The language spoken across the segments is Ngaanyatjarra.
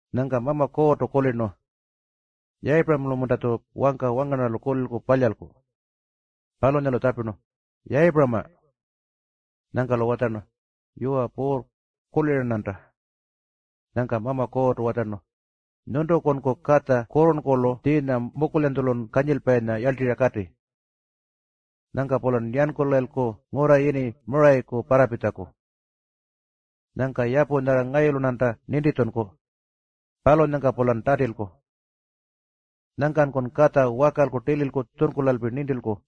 Nyangka Mama Kuurrtu kulirnu, “Yayipuramalu-munta-tju wangka wangarnarralu kulilku palyalku?” Palunyalu tjapirnu, “Yayipurama!” Nyangka-lu watjarnu, “Yuwa Puurr, kulira-rnanta.” Nyangka Mama Kuurrtu watjarnu, “Nyuntukunku katja kurrurnkurlu tjiinyan mukulyanytjulu kanyilpayilu yarltirra kati. Nyangka-pulan yankulayilku ngurra yini Murayaku parrapitjaku. Nyangka yapu nyarra ngayulu-rnanta nintitjunku, palunyangka-pulan tatilku. Nyangkanku katja wakalku tililku tjunkulalpi ngayuku nintilku.”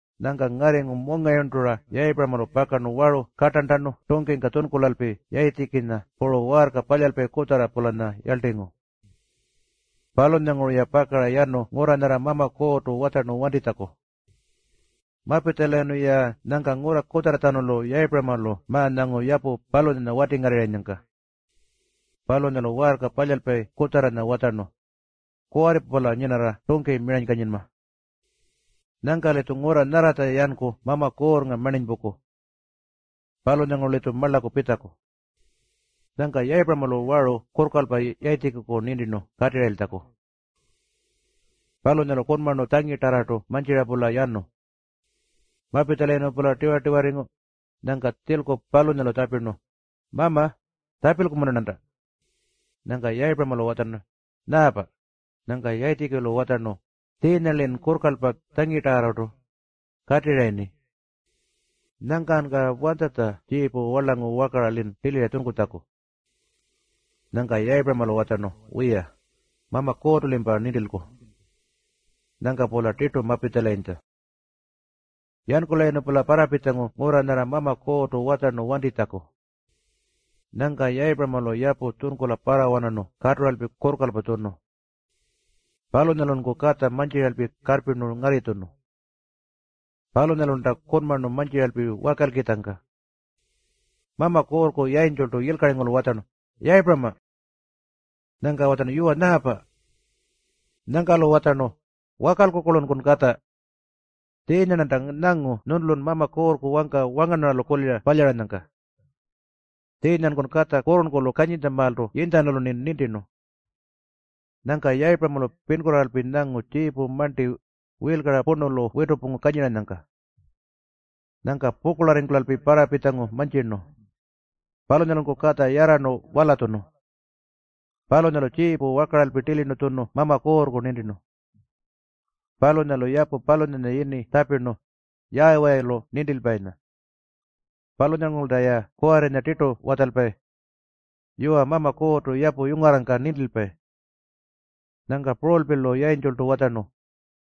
Nyangka ngarringu mungayurntura Yayipuramalu pakarnu waru kartarntanu tungkingka tjunkulalpi Yayitjikinya puru waarka palyalpayi kutjarra-pulanya yarltingu. Palunyanguru-ya pakara yanu ngurra nyarra Mama Kuurrtu watjarnu wantitjaku. Mapitjalayirnu-ya, nyangka ngurra kutjarratjanulu Yayipuramalu ma-nyangu yapu palunyanya watingarrirranyangka. Palunyalu waarka palyalpayi kutjarranya watjarnu, “Kuwarripa-pula nyinarra tungki miranykanyinma. Nyangka-litju ngurra nyarratja yanku Mama Kuurrnga marninypungku. Palunyanguru-litju marlaku pitjaku.” Nyangka Yayipuramalu waru kurrkalpa Yayitjikiku nintirnu katirrayiltjaku. Palunyalu kunmarnu puru tjangitarrartu mantjira-pula yanu. Mapitjalayirnu-pula tiwa-tiwarringu, nyangka tjilku palunyalu tjapirnu, “Mama, tjapilku-munta-rnanta?” Nyangka Yayipuramalu watjarnu, “Nyaapa?” Nyangka Yayitjikilu watjarnu, “Tjiinya-lin kurrkalpa, tjangitarrartu katirrayirni. Nyangkanyka wanytjatja tjiipu warlangu wakara-lin tilira tjunkutjaku?” Nyangka Yayipuramalu watjarnu, “Wiya, Mama Kuurrtu-limpa nintilku.” Nyangka-pula tirtu mapitjalayintja. Yankulayirnu-pula parrapitjangu ngurra nyarra Mama Kuurrtu watjarnu wantinytjaku. Nyangka Yayipuramalu yapu tjunkula parrawanarnu katuralpi kurrkalpa tjunu. Palunyalunku katja mantjiralpi karrpirnu ngarritjunu. Palunyalulta kunmarnu mantjiralpi wakalkitjangka, Mama Kuurrku yayintjultu yilkaringurulu watjarnu, “Yayipurama!” Nyangka watjarnu, “Yuwa, kulira-rnanta.” Nyangka-lu watjarnu, “Wakalku-kurlunkun katja. Wanti. Tjiinya-rnanta nyangu nyuntulun Mama Kuurrku wangka wangarnarralu kulira palyaranyangka. Tjiinyanku katja kurrurnkurlu kanyintjamaaltu yinytjanulu-rni nintirnu.” Nyangka Yayipuramalu pinkurraaralpi tjiipu marnti nyangu, tjiinya purnulu kata witurrpungu kanyiranyangka. Nyangka pukurlarringkula parrapitjangu mantjirnu. Palunyalunku katja yarrarnu walatjunu. Palunyalu tjiipu wakaralpi tilirnu tjunu Mama Kuurrku nintirnu. Palunyalu yapu palunyanya yini tjapirnu, Yaawayilu Nintilpayinya. Palunyangurulta-ya kuwarrinya tirtu watjalpayi, “Yuwa, Mama Kuurrtu yapu yungarrangka nintilpayi.” Nyangka purulpi-lu yayintjultu watjarnu,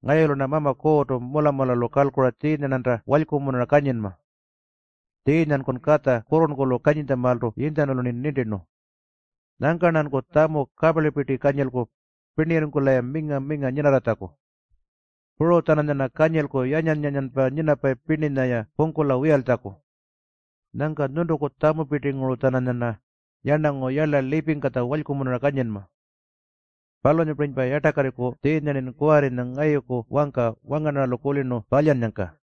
“Ngayulu-rna Mama Kuurrtu mula-mulalu kalkura tjiinya-rnanta walykumunura kanyinma. Tjiinyanku katja kurrurnkurlu kanyintjamaaltu yinytjanulu nintirnu. Nyangka-rnanku tjamu kaparlipirti kanyilku pirnirringkula-ya minga-minga nyinarratjaku. Puru-tjananyarna kanyilku yanyan-yanyanpa nyinapayi pirninya-ya pungkula wiyaltjaku. Nyangka nyuntuku tjamupirtinguru-tjananyarna yarnangu yarla lipingkatja walykumunura kanyinma. Palunyapirinypa yartakarriku tjiinya-rnin kuwarrinya ngayuku wangka wangarnarralu kulirnu palyannyangka.”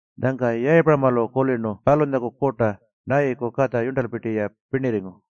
Nyangka Yayipuramalu kulirnu palunyaku kurta Nayiyuku katja yurntalpa-ya pirnirringu.